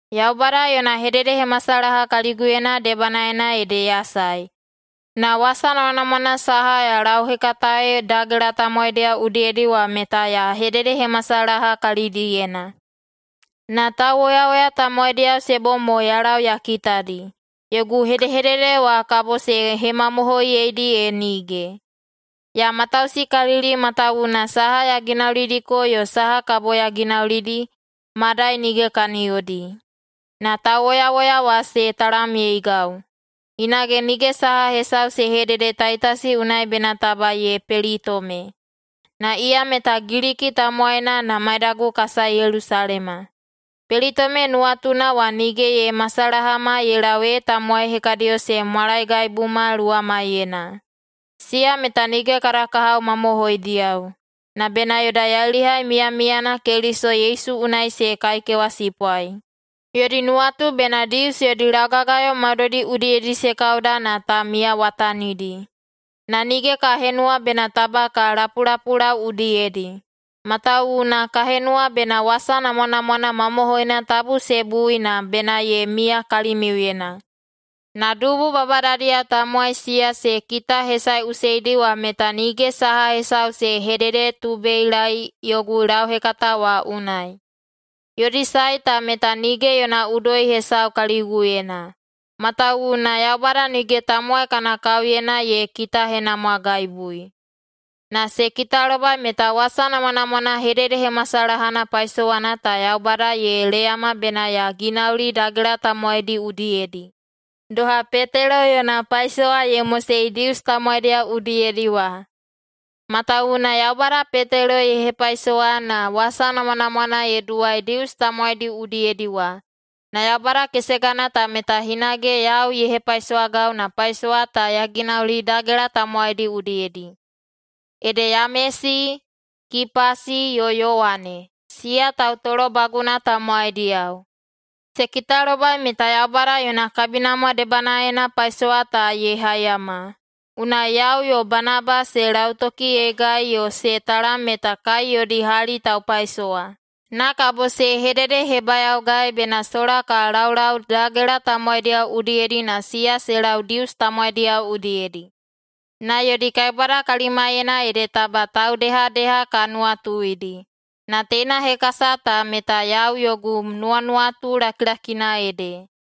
Yaubada yona hededehemasalaha kaliguyena debanaena ede ya sae, na wasa namwanamwana saha ya lauhekataei dagela tamowaidiyao udiyedi wa meta ya hededehemasalaha kalidiyena. Na tauwoyawoya tamowaidiyao se bom mo ya lau ya kitadi, yogu hedehedede wa kabo se hemamohoiyeidi e nige. Ya matausikalili matawuwuna saha ya ginaulidiko yo saha kabo ya ginaulidi, madai nige kaniyodi. Na tauwoyawoya wa se talamyeigau. Hinage nige saha hesau se hedede Taitasi unai bena taba ye pelitome. Na iya meta Giliki tamowaina na maidagu ka sae Yelusalema. Pelitome nuwatuna wa nige ye masalahama ye lau ee tamowai hekadiyo se mwalaegaibuma luwamaiyena. Siya meta nige kada kahao mamohoidiyao, na bena yoda yailihai miyamiyana Keliso Yesu unai se kaikewasipwai. Yodi nuwatu bena Dius yodi laugagayo maudoidi udiyedi se kauda na ta miyawatanidi. Na nige ka henuwa bena taba ka lapulapulau udiyedi, matawuwuna ka henuwa bena wasa namwanamwana mamohoina tabu se bui na bena ye miya kalimiuyena. Na dubu babadadiyao tamowai siya se kitahesaeꞌuseidi wa meta nige saha hesau se hededetubeilaei yogu lauhekata wa unai. Yodi sae ta meta nige yona udoi hesau kaliguyena, matawuwuna Yaubada nige tamowai kana kaoyena ye kitahenamwagaibui. Na se kitalobai meta wasa namwanamwana hededehemasalahana paisowana ta Yaubada ye leyama bena ya ginauli dagela tamowaidi udiyedi, doha Petelo yona paisowa ye mosei Dius tamowaidiyao udiyedi wa. Matawuwuna Yaubada Petelo ye hepaisowa na wasa namwanamwana ye duwai Dius tamowaidi udiyedi wa, na Yaubada kesegana ta meta hinage yau ye hepaisowagau na paisowa ta ya ginauli dagela tamowaidi udiyedi. Ede Yamesi, Kipasi yo Yowane, siya tautolobaguna tamowaidiyao, se kitalobai meta Yaubada yona kabinamwa debanaena paisowa ta ye haiyama. Unai yau yo Banaba se lautokiyeigai yo se talam meta kai yodi hali taupaisowa. Na kabo se hededehebayaogai bena sola ka laulau dagela tamowaidiyao udiyedi na siya se lau Dius tamowaidiyao udiyedi. Na yodi kaibwada kalimaiyena ede taba taudehadeha ka nuwatuidi, na teina hekasa ta meta yau yogu nuwanuwatu lakilakina ede.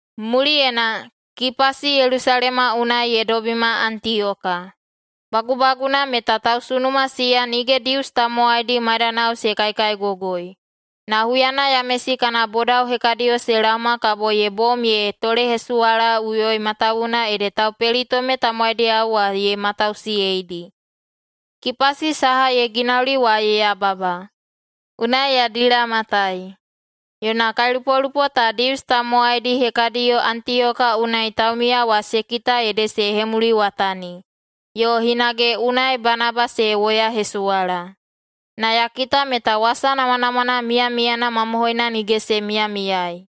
Muliyena, Kipasi Yelusalema unai ye dobima Antiyoka. Bagubaguna meta tausunuma siya nige Dius tamowaidi maidanao se kaikaigogoi, na huyana Yamesi kana bodao hekadiyo se laoma kabo ye bom ye tolehesuwalaꞌuyoi matawuwuna ede taupelitome tamowaidiyao wa ye matausiyeidi. Kipasi saha ye ginauli wa ye yababa, unai ya dilamatai. Yona kailupolupo ta Dius tamowaidi hekadiyo Antiyoka unai taumiya wa se kita ede se hemuliwatani, yo hinage unai Banaba se woyahesuwala. Na ya kita meta wasa namwanamwana miyamiyana mamohoina nige se miyamiyai,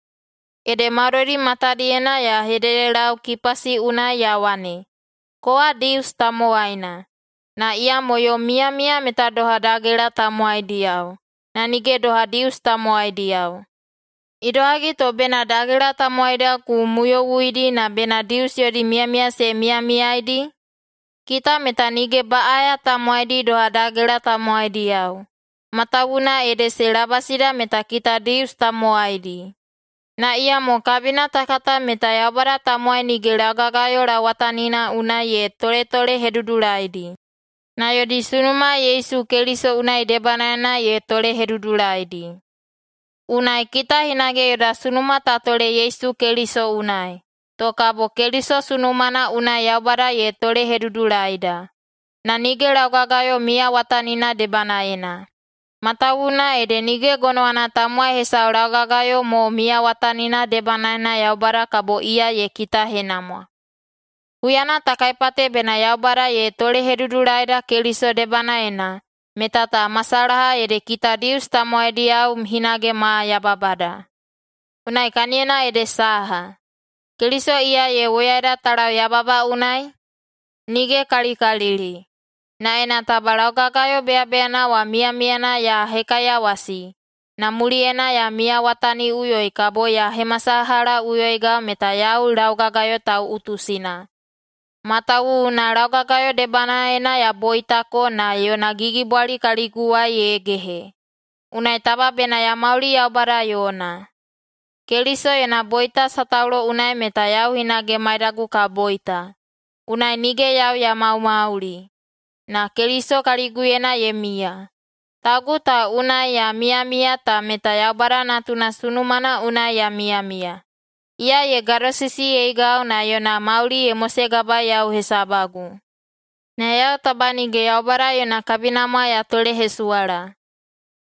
ede maudoidi matadiyena ya hededelau Kipasi unai ya wane, “Kowa Dius tamowaina, na iyamo yom miyamiya meta doha dagela tamowaidiyao, na nige doha Dius tamowaidiyao. Idohagi to bena dagela tamowaidiyao ku muyowuidi na bena Dius yodi miyamiya se miyamiyaeidi? Kita meta nige baꞌaya tamowaidi doha dagela tamowaidiyao, matawuwuna ede se labasida meta kita Dius tamowaidi. Na iyamo kabina ta kata meta Yaubada tamowai nige laugagayo lauwatanina unai ye toletolehedudulaidi, na yodi sunuma Yesu Keliso unai debanaena ye tolehedudulaidi. Unai kita hinage yoda sunuma ta tole Yesu Keliso unai, to kabo Keliso sunumana unai Yaubada ye tolehedudulaida, na nige laugagayo miyawatanina debanaena. Matawuwuna ede nige gonowana tamowai hesau laugagayo mo miyawatanina debanaena Yaubada kabo iya ye kitahenamwa. Huyana ta kaipate bena Yaubada ye tolehedudulaida Keliso debanaena, meta ta masalaha ede kita Dius tamowaidiyao hinage ma yababada. Unai kaniyona ede saha, Keliso iya ye woyaida ta lau yababa unai? Nige kalikalili! Na ena taba laugagayo beyabeyana wa miyamiyana ya hekaiyawasi, na muliyena ya miyawataniꞌuyoi, kabo ya hemasalahaꞌuyoigau meta yau laugagayo tauꞌutusina. Matawuwuna laugagayo debanaena ya boitako na yona gigibwali kaliguwai ye gehe. Unai taba bena ya mauli Yaubada yona. Keliso yona boita sataulo unai meta yau hinage maidagu ka boita. Unai nige yau ya maumauli, na Keliso kaliguyena ye miya. Taugu ta unai ya miyamiya ta meta Yaubada Natuna sunumana unai ya miyamiya, iya ye gadosisiyeigau na yona mauli ye mosegabaei yau hesabagu. Na yau taba nige Yaubada yona kabinamwa ya tolehesuwala,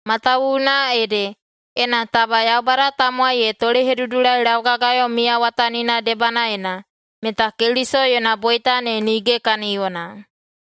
matawuwuna ede, ena taba Yaubada tamowai ye tolehedudulai laugagayo miyawatanina debanaena, meta Keliso yona boita ne nige kaniyona.”